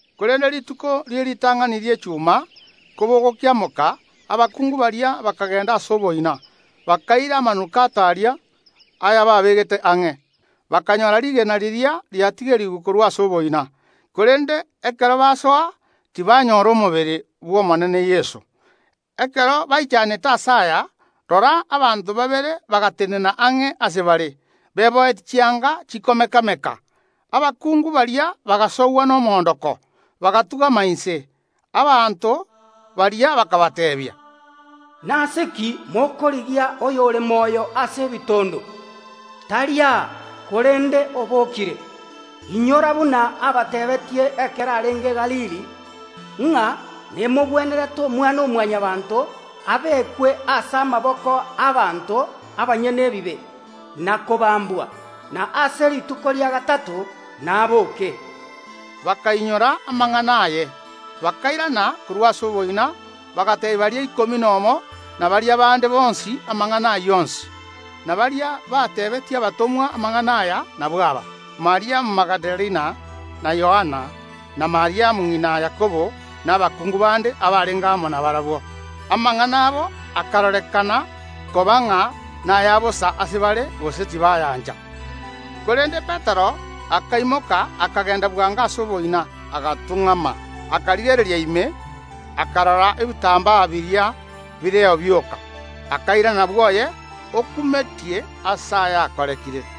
Korende rituko rie ritang’ani ri’echuma, kobogokiamoka, abakungu baria bakagenda ase oboina, bakaira amanukato aria, ayababegete ang’e. Bakanyoora rigena riria riatigerigwe korwa ase oboina, korende ekero basoa, tibanyoora omobere Omonene Yeso. Ekero baichanete ase aya, rora, abanto babere bagatenena ang’e ase bare, beboyetie chianga chikomeka‐meka. Abakungu baria bagasogwa nomoondoko, bagatung’ama inse. Abanto baria bakabateebia, “Nase ki mokorigia oyore moyo ase ebitondo? [Tari aa, korende obokire.] Inyora buna abatebeetie ekero arenge Galili, ng’a nemogwenerete Omwana‐o‐Mwanyabaanto abekwe ase amaboko y’abanto abanyene ebibe, na kobambwa, na ase rituko ria gatato nabooke.” Bakainyora amang’ana aye. Bakairana korwa ase oboina, bagateebia baria ikomi nomo na baria abande bonsi amang’ana ayio onsi. Na baria bateebetie abatomwa amang’ana aya nabwo aba: Mariamu Magidalena, na Yoana, na Mariamu ng’ina Yakobo na abakungu bande abarenge amo nabarabwo. Amang’ana abo akarorekana koba ng’a naya bosa ase bare, gose tibayancha. [ Korende Petero akaimoka, akagenda bwango ase oboina, agatung’ama, akarigereria ime, akarora ebitambaa biria bireo bioka, akairana bwoye, okumetie ase aya akorekire.]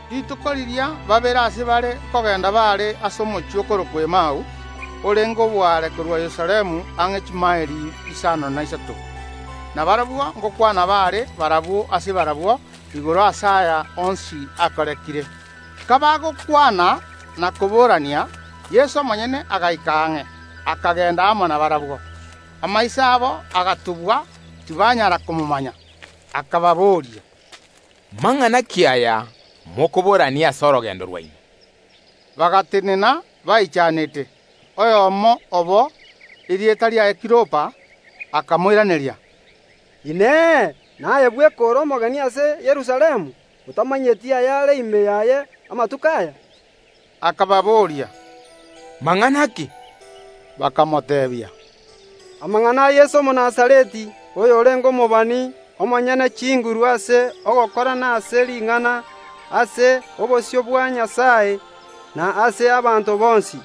Rituko riria babere ase bare nkogenda baare ase omochie okorokwa Emau, orenge oboare korwa Yerusalemu ang’e chimaeli isano na isato. Na barabwo ngokwana baare barabwo ase barabwo igoro ase aya onsi akorekire. Kabagokwana na koborania, Yeso omonyene agaika ang’e, akagenda amo nabarabwo. Amaiso abo agatubwa, tibanyara komomanya. Akababoria, “Mang’ana ki aya mokoborania ase orogendo rwaino?” Bagatenena, baichanete. Oyomo obo, erieta riaye Kiliopa, akamoiraneria, “Inee! Naye bweka ore omogeni ase Yerusalemu, otamanyeti ayare ime yaye amatuko aya?” Akababoria, “Mang’ana ki?” Bakamoteebia, “Amang’ana a Yeso Omonazareti, oyorenge omobani, omonyene chinguru ase ogokora na ase ring’ana, ase obosio bwa Nyasae, na ase abanto bonsi;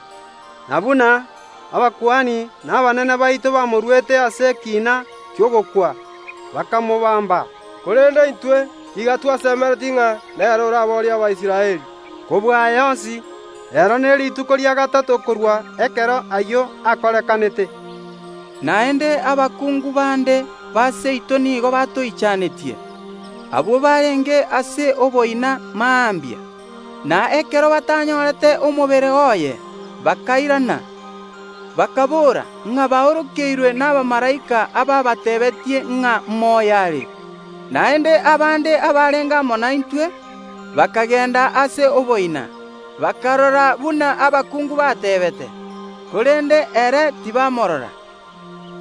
na buna abakuani abanene na abanene baito bamoruete ase ekiina ki’ogokwa, bakamobaamba. Korende intwe nigo twasemeretie ng’a nere oraboorie Abaisraeli. Kobua aya onsi, reero nerituko ria gatato korwa ekero ayio akorekanete. Naende abakungu bande ba seito nigo batoichanetie. Abwo barenge ase oboina mambia, na ekero batanyorete omobere oye, bakairana, bakaboora ng’a baorokeirwe nabamalaika ababatebetie ng’a moyo are. Naende abande abarenge amo naintwe bakagenda ase oboina, bakarora buna abakungu bateebete, korende ere tibamorora.”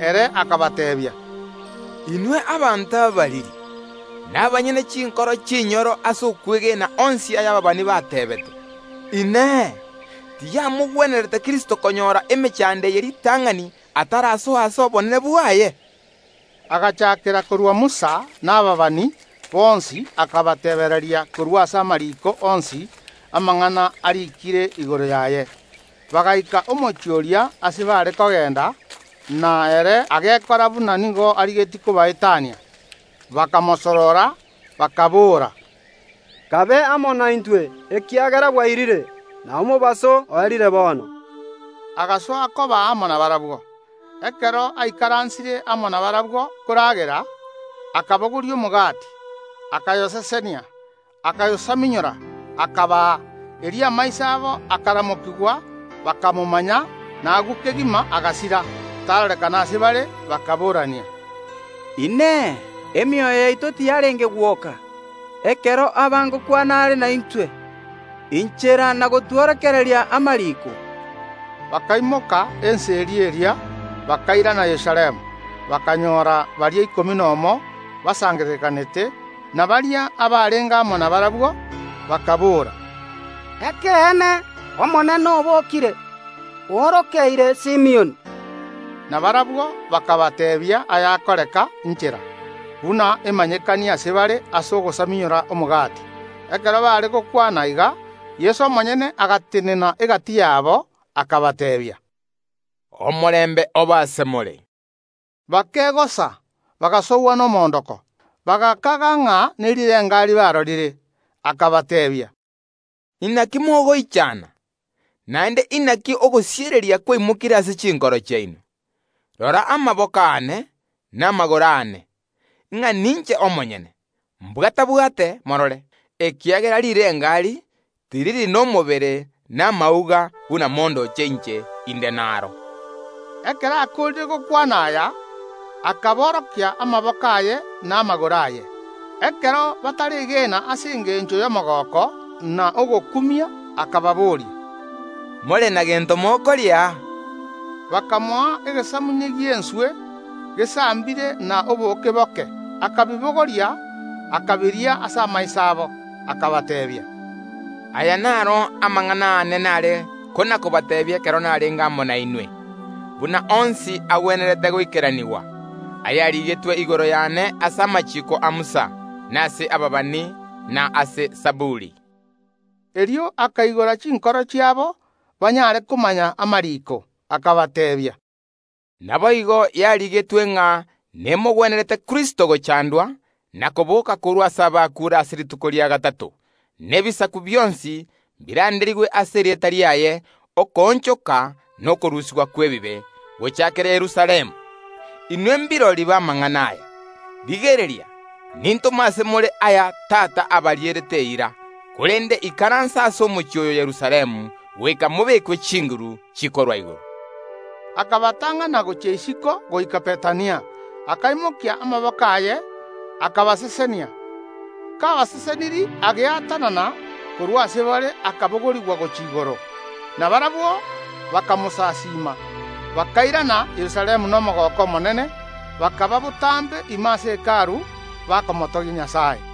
Ere akabateebia, “Inwe abanto abariri, nabanyene chinkoro chinyoro ase okwegena onsi aya ababani bateebete. Inee! Tiyamogwenerete Kristo konyora emechando eye ritang’ani atarasoa ase obonene bwaye?” Agachaakera korwa Musa na ababani bonsi akabateebereria korwa ase amariiko onsi amang’ana ariikire igoro yaye. Bagaika omochie oria ase baare kogenda, na ere agekora buna nigo arigetie kobaetania. Bakamosorora, bakaboora, “Kabe amo naintwe, ekiagera bwairire, na omobaso oerire bono.” Agasoa koba amo nabarabwo. Ekero aikaransire amo nabarabwo koragera, akabogoria omogati, akayosesenia, akayosamunyora, akabaa. Erio amaiso abo akaramokigwa, bakamomanya; na agwo kegima agasira, tarorekana ase bare. Bakaboorania, “Inee! Emioyo yaito tiyarenge gwoka ekero aba ngokwana are naintwe inchera na gotworokereria amariiko?” Bakaimoka ensa eria eria, bakairana Yerusalemu, bakanyoora baria ikomi nomo basangererekanete, na baria abarenge amo nabarabwo, bakaboora, “Ekeene, Omonene obokire, oorokeire Simioni.” Na barabwo bakabateebia aya akoreka inchera, buna emanyekania ase bare ase ogosamunyora omogati. Ekero baare gokwana iga, Yeso omonyene agatenena egati yabo, akabateebia, “Omorembe obe ase more!” Bakegosa, bagasogwa nomoondoko, bagakaga ng’a nerirengari barorire. Akabateebia, “Inaki mogoichana? Naende inaki ogosiereria kwaimokire ase chinkoro chiaino? Rora amaboko aane na amagoro aane, ng’a ninche omonyene; mbwata‐bwate, morore, ekiagera rirengari tiriri nomobere na amauga buna mondoche inche inde nabio.” Ekero akoorire gokwana aya akaborokia amaboko aye na amagoro aye. Ekero bataregena ase engencho y’omogooko, na ogokumia, akababoria, “More na gento mokoria aa?” Bakamoa egesamunye gi’enswe gesambire na obooke boke. Akabibogoria, akabiria ase amaiso abo. Akabateebia, “Aya naro amang’ana aane nare kona‐kobateebia ekero narenge amo nainwe, buna onsi agwenerete goikeranigwa, ayarigetwe igoro yane ase amachiiko a Musa, na ase ababani, na ase Zaburi.” Erio akaigora chinkoro chiabo, banyare komanya amariiko. Akabateebia, “Naboigo yarigetwe ng’a nemogwenerete Kristo gochandwa, na koboka korwa ase abakuure ase rituko ria gatato; na ebisaku bionsi mbiranderigwe ase erieta riaye okoonchoka na okorusigwa kw’ebibe, gochaakera Yerusalemu. Inwe mbirori b’amang’ana aya. Rigereria, nintome ase more aya Tata abarierete eira, korende ikaransa ase omochie oyo Yerusalemu goika mobekwe chinguru chikorwa igoro.” Akabatang’ana gochia isiko goika Bethania; akaimokia amaboko aye, akabasesenia. Kabasesenirie ageatanana korwa ase bare akabogorigwa gochia igoro. Na barabwo bakamosasiima, bakairana Yerusalemu nomogooko omonene; bakaba botambe ime ase Hekalu, bakomotogia Nyasae.